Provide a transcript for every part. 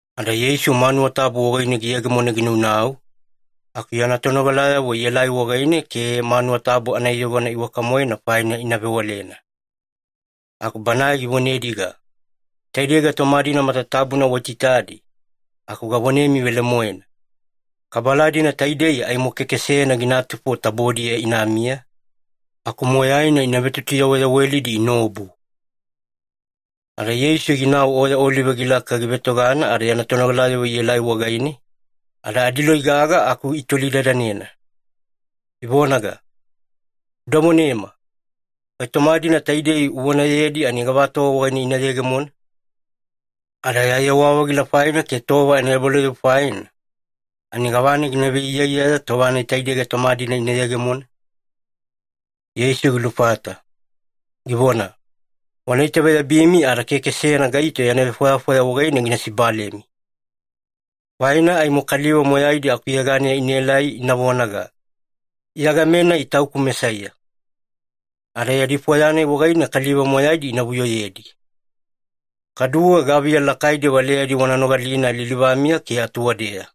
Ada Yeisu manuwa tabu wagaine giyegemona ginaunau, aku yana tonogalayavo ielai wagaine ke manuwa tabu anaiyogona iwaka-moena faina ina vewalena. Aku Banae givonediga, “Taidei gaitoma-dina matatabuna waitaitadi, aku gavonemi velemoena, kabala-dina taidei aimo keke seyana ginatufo tabodiya inamiya, aku moyaina ina vetutuyaweyawelidi inaobu.” Ada Yeisu ginau Oya Olive gilaka givetogana ada yana tonogalayavo ielai wagaine, ada adiloi gaga aku itolidadanena, ivonaga, “Uda vonema, gaitoma-dina taidei uvonayedi ani gavatova wagaine ina yegemona? Ada ya yewa-vagila faina ke tova anaebalauyabu faina, ani gavana gina veiyaiyaya tova-nai taidei gaitoma-dina ina yegemona?” Yeisu gilufata, givona, “Wana itaveyabimi ada keke seyana gaito yana vefwayafwaya wagaine gina sibalemi. Faina aimo kaliva moyaidi akuyeganeya inaelai ina vonaga, ‘Iya game-nai tauku Mesaiya!’ Ada yadi fwaya-nai wagaine kaliva moyaidi ina vuyoyedi. Kaduwe gaviya lakaidi valeyadi wana nogalina lilivamiya ke atuwadeya.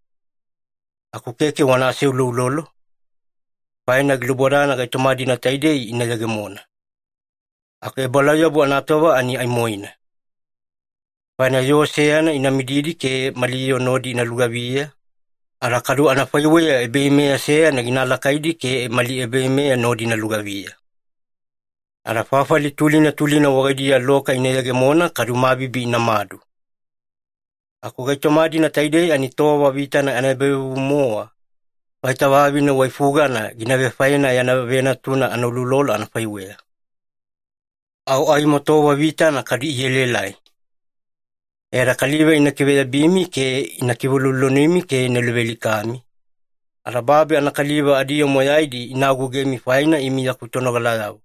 Aku keke wana aseuloulolo, faina gilubodana gaitoma-dina taidei ina yegemona. Aku ebalauyabu anatova ani aimoina. Faina yoo seyana ina mididi ke mali yoo nodi ina lugaviya, ada kadu anafaiweya ebaveimeya seyana gina alakaidi ke mali ebaveimeya nodi ina lugaviya. Ada fafali tulina tulina wagaidiya loka ina yegemona kadu mabibi inamadu. Aku gaitoma-dina taidei ani tova vitana anaebavevuvu-mowa, vaita vavine waifugana gina vefaena yana venatuna anauloulolo anafaiweya. Au aimo tova vitana kadu ielaelai. E ada kaliva ina kiveyabimi ke ina kiveuloulolonimi ke ina luvealikami, ada babi anakaliva adiyoo moyaidi ina agougemi faina imi yaku tonogalayavo.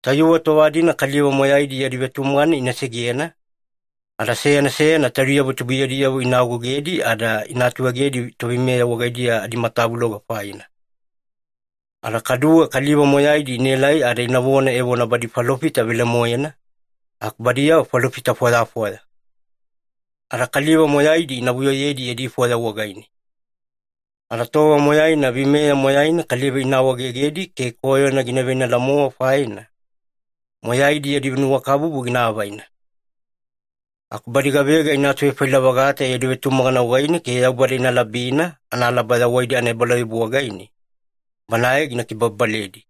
Tayuwe tova-dina kaliva moyaidi yadi vetumagana ina segena, ada seyana seyana taudiyavo tubuiyadiyavo ina agougedi ada ina atuegedi toveimeya wagaidiya adimatavuloga faina. Ada kaduwe kaliva moyaidi inaelai ada inavona evona badi falofita velemoena, aku badiyavo falofita fwayafwaya. Ada kaliva moyaidi ina vuyoyedi yadi fwaya wagaine. Ada tova moyaina veimeya moyaina kaliva ina awaegegedi ke koyona gina veinala-mowa faina, moyaidi yadi nuwakabubu gina avaina. Aku badi gavega ina atuvefaila-vagata yadi vetumagana wagaine ke Yaubada ina labina analaba yawaidi anaebalauyabu wagaine, Banae gina kibababaledi.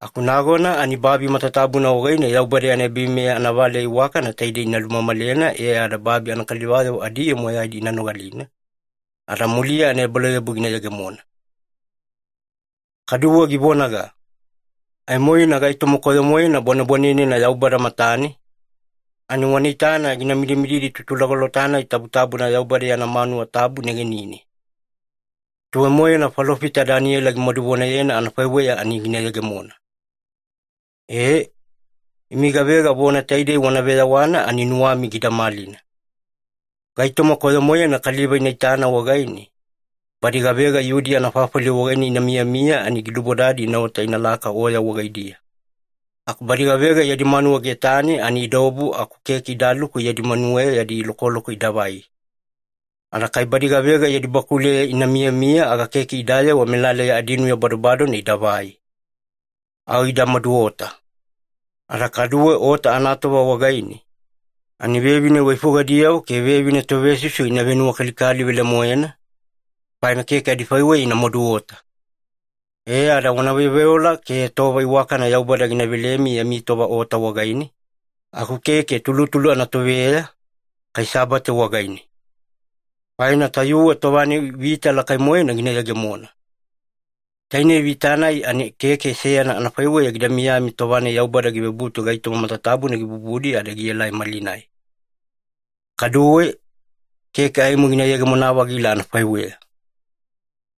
Aku nagona ani babi matatabuna wagaine Yaubada yana ebaveimeya anavaleya iwakana taidei ina lumamalena e ada babi anakaliva adiyoo moyaidi ina nogalina, ada muliya ebalauyabu gina yegemona.” Kaduwe givonaga, “Aimoina gaitoma koyo-moena bwanebwanenena Yaubada matane, ani wana itana gina midimididi Tutulagolota-nai Tabutabuna Yaubada yana manuwa tabu negenine. Tuwai-moena falofita Daniela gimaduvonayena anafaiweya ani gina yegemona. E, imi gavega vona taidei wana veyawana ani nuwami gida malina. Gaitoma koyo-moena kaliva ina itana wagaine, badi gavega Yudiya anafafali wagaine ina miyamiya ani gilubodadi inaota inalaka oya wagaidiya. Aku badi gavega yadi manuwa getane ani idaobu aku keke idaluku yadi manuweya yadi lokoloko idavai. Ada kai badi gavega yadi bakuleya ina miyamiya aga keke idayewa melaleya adinuya badobadona idavai. Au ida maduota. Ada kaduwe ota anatova wagaine, ani vevine waifugadiyavo ke vevine tovesusu ina venuwakalikali velemoena, faina keke adifaiweya ina maduota. E ada wana veoveola ke tova iwakana Yaubada gina velemi yami tova ota wagaine, aku keke tulutulu anatoveya, kai Sabate wagaine. Faina tayuwe tova-nai vita lakai-moena gina yegemona. Tainei vita-nai ani keke seyana anafaiweya gida miyami tova-nai Yaubada givebutu gaitoma matatabuna gibubudi ada gielai malinai. Kaduwe, keke aimo gina yegemona-vagila anafaiweya.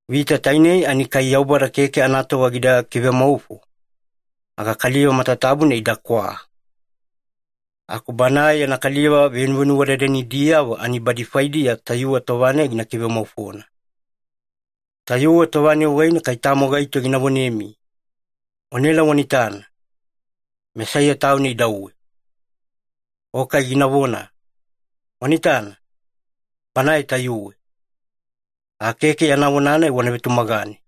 Vita tainei ani kai Yaubada keke anatova gida kivemaufo, aga kaliva matatabuna idakwa. Aku Banae yana kaliva venuvenuwadadanidiyavo ani badi faidiya tayuwe tova-nai gina kivemaufona. Tayuwe tova-nai wagaine kai tamo gaito gina vonemi, ‘Wanaela wana itana, Mesaiya Tauna idauwe!’ o kai ginavona, ‘Wana itana, Banae tayuwe!’ aga keke yana vona-nai wana vetumagane.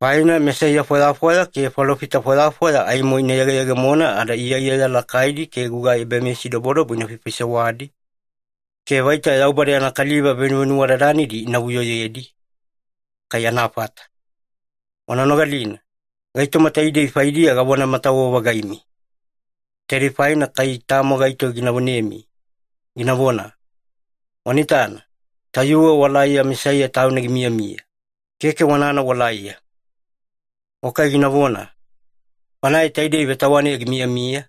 Faina mesaiya fwayafwaya ke falofita fwayafwaya aimo ina yegeyegemona ada iyaiyaya lakaidi ke gugai ebameyasidobodobo ina faifaisewadi, ke vaita Yaubada yana kaliva venuvenuwadadanidi ina vuyoyedi, kai anafata. Wana nogalina, gaitoma taidei faidiya gavonamatawe-vagaimi. Taidei faina kai tamo gaito gina vonemi, ginavona, ‘Wana itana, tayuwe walaiya Mesaiya Tauna gimiyamiya,’ keke wanana walaiya. O kai ginavona, ‘Banae taidei vetawaneya gimiyamiya,’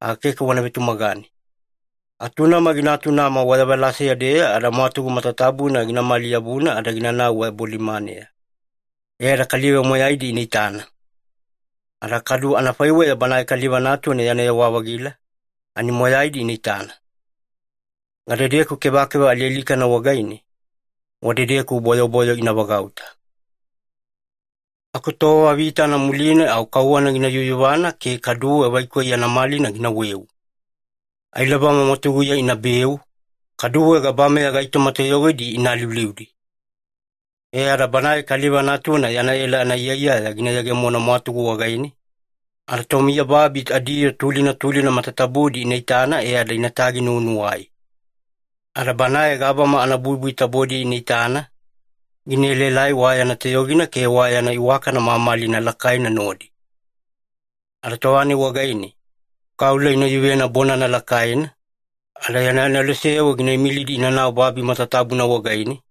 aga keke wana vetumagane. Atunama gina atunama wayavalaseya-deya ada mwatugu matatabuna ginamali-yabuna ada ginanau wabolimaneya, e ada kaliva moyaidi ina itana. Ada kadu anafaiweya Banae Kaliva Natuna yana yewa-vagila, ani moyaidi ina itana. Gadedeku kevakeva alialikana wagaine, wadedeku bwayobwayo ina vagauta. “Aku tova vitana muline au kauwana gina yuyuvana ke kaduwe vaikoi yana malina ginaweu. Ailabama mwatuguya inabeu, kaduwe gabameya gaitoma toyogidi ina aliuliudi. E ada Banae Kaliva Natuna yana ela anaiyaiyaya gina yegemona mwatugu wagaine, ada tomiyababi adiyoo tulina tulina matatabudi ina itana e ada inatagi-nuwanuwai. Ada Banae gabama anabuibui tabodiya ina itana, gina elaelai wa yana toyogina ke wa yana iwakana mamalina lakaina nodi. Ada tova-nai wagaine, kaula ina yuvena bonana lakaina, ada yana aneloseyavo gina imilidi inanau babi matatabuna wagaine,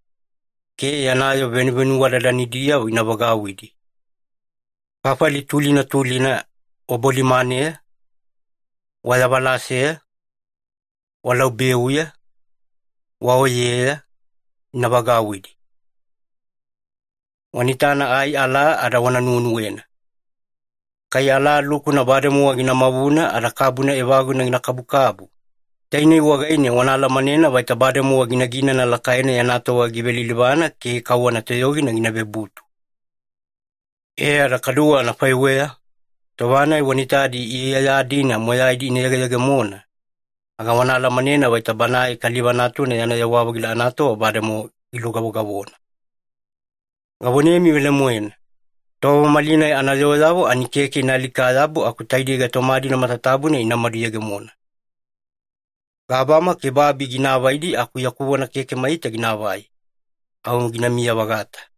ke yana yoo venuvenuwadadanidiyavo ina vagauwidi. Fafali tulina tulina wabolimaneya, wayavalaseya, walaubeuya, waoyeya, ina vagauwidi. “Wana itana ai alaa ada wana nuwenuwena. Kai alaa lukuna bademowa gina mavuna ada kabuna evaguna gina kabukabu, tainei wagaine wana alamanena vaita bademowa ginaginana lakaina yana tova givelilivana ke kauwana toyogina gina vebutu. E ada kaduwe anafaiweya, tova-nai wana itadi iyaiyaya-dina moyaidi ina yegeyegemona, aga wana alamanena vaita Banae Kaliva Natuna yana yewa-vagila anatova bademowa gilugavogavona. Gavonemi velemoena, tova malinai anayooyavo ani keke ina alika-yabu aku taidei gaitoma-dina matatabuna inamadu yegemona. Gabama ke babi gina avaidi aku yaku vona keke maita ginaavai, au ginamiya-vagata.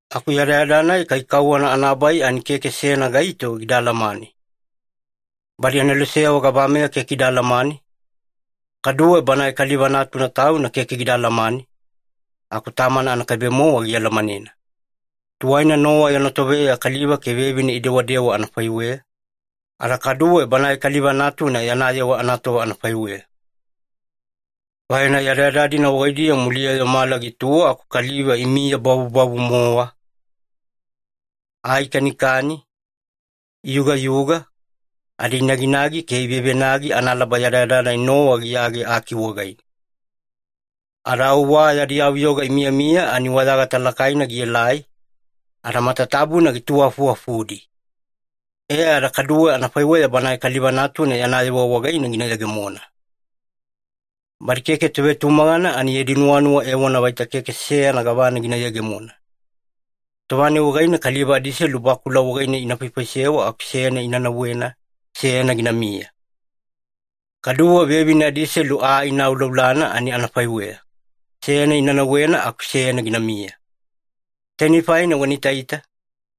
“Aku yadayada-nai kai kauwana anabai ani keke seyana gaito gida alamane. Badi aneloseyavo gabameya keke ida alamane, kaduwe Banae Kaliva Natuna Tauna keke gida alamane, aku Tamana anakaibe-mowa gialamanena. Tuwaina Nowa yana toveya kaliva ke vevine idewadewa anafaiweya, ada kaduwe Banae Kaliva Natuna yana yewa anatova anafaiweya. Faina yadayada-dina wagaidiya muliya-yo mala gituwa aku kaliva imiyabavubavu-mowa. Aa ikanikani, iyugayuga, ada inaginagi ke ivevenagi analaba yadayada-nai Nowa giyage aki wagaine. Ada au wa yadi yavuyoga imiyamiya ani wayagata lakaina gielai, ada matatabuna gituwaafufudi. E ada kadu anafaiweya Banae Kaliva Natuna yana yewa wagaine gina yegemona. Badi keke tovetumagana ani yadi nuwanuwa evona vaita keke seyana gavana gina yegemona. Tova-nai wagaine kaliva adiselu bakula wagaine ina faifaisewa aku seyana ina nauwena, seyana ginamiya. Kaduwe vevine adiselu aa ina auaulana ani anafaiweya, seyana ina nauwena aku seyana ginamiya. Tainei faina wana itaita,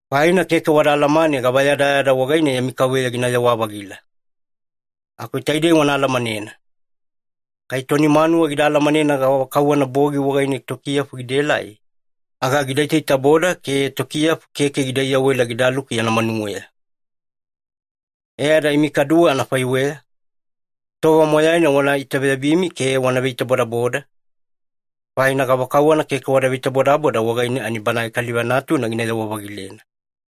faina keke wada alamane gavayadayada wagaine yami Kauveya ginayewa-vagila. Aku taidei wana alamanena. Kai toni manuwa gida alamanena gavakauwana bogi wagaine tokiyafu gidaelai, aga gida itaitaboda ke tokiyafu keke gida iyawela gidaluku yana manuweya. E ada imi kaduwe anafaiweya, tova moyaina wana itaveyabimi ke wana veitabodaboda, faina gavakauwana keke wada veitabodaboda wagaine ani Banae Kaliva Natuna ginayewa-vagilena.”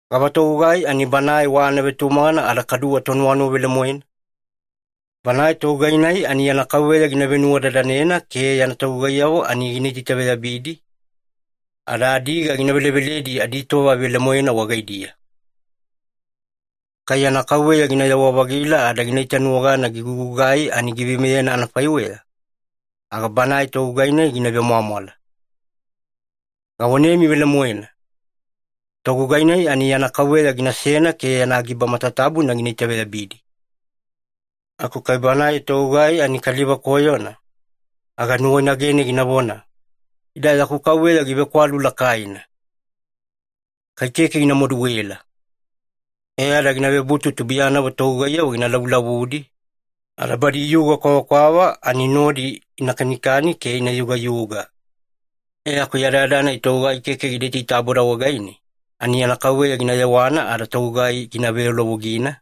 “Gava togugai ani banae wa anavetumagana ada kadu tonuwanuwa velemoena? Banae togugai-nai ani yana kauveya gina venuwadadanena ke yana togugaiyavo ani gina itaitaveyabidi, ada adiga gina veleveledi aditova velemoena wagaidiya. Kai yana kauveya ginayewa-vagila ada gina itanuwagana gigugugai ani giveimeyena anafaiweya, aga banae togugai-nai gina vemwamwala. Gavonemi velemoena, togugai-nai ani yana kauveya ginasena ke yana giba matatabuna gina itaveyabidi. Aku kai banae togugai ani kaliva koyona, aga nuwainagene ginavona, ‘Ida yaku kauveya givekwalu lakaina. Kai keke gina maduela.’ E ada gina vebutu tubuiyanavo togugaiyavo gina lavulavudi, ada badi iyuga kwavakwava ani nodi ina kanikani ke ina yugayuga. E aku yadayada-nai togugai keke gida itaitaboda wagaine, ani yana kauveya gina yewana ada togugai gina veyaulovogina,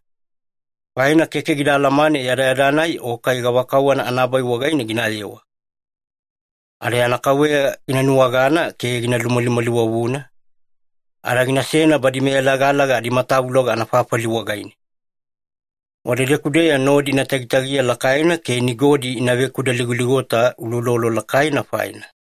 faina keke gida alamane yadayada-nai o kai gavakauwana anabai wagaine ginayewa. Ada yana kauveya gina nuwagana ke gina lumalimaliwavuna, ada ginasena badi meyalagalaga adimatavuloga anafafali wagaine. Wadedeku-deya nodi ina tagitagiya lakaina ke nigodi ina vekudaligoligota uloulolo lakaina faina.”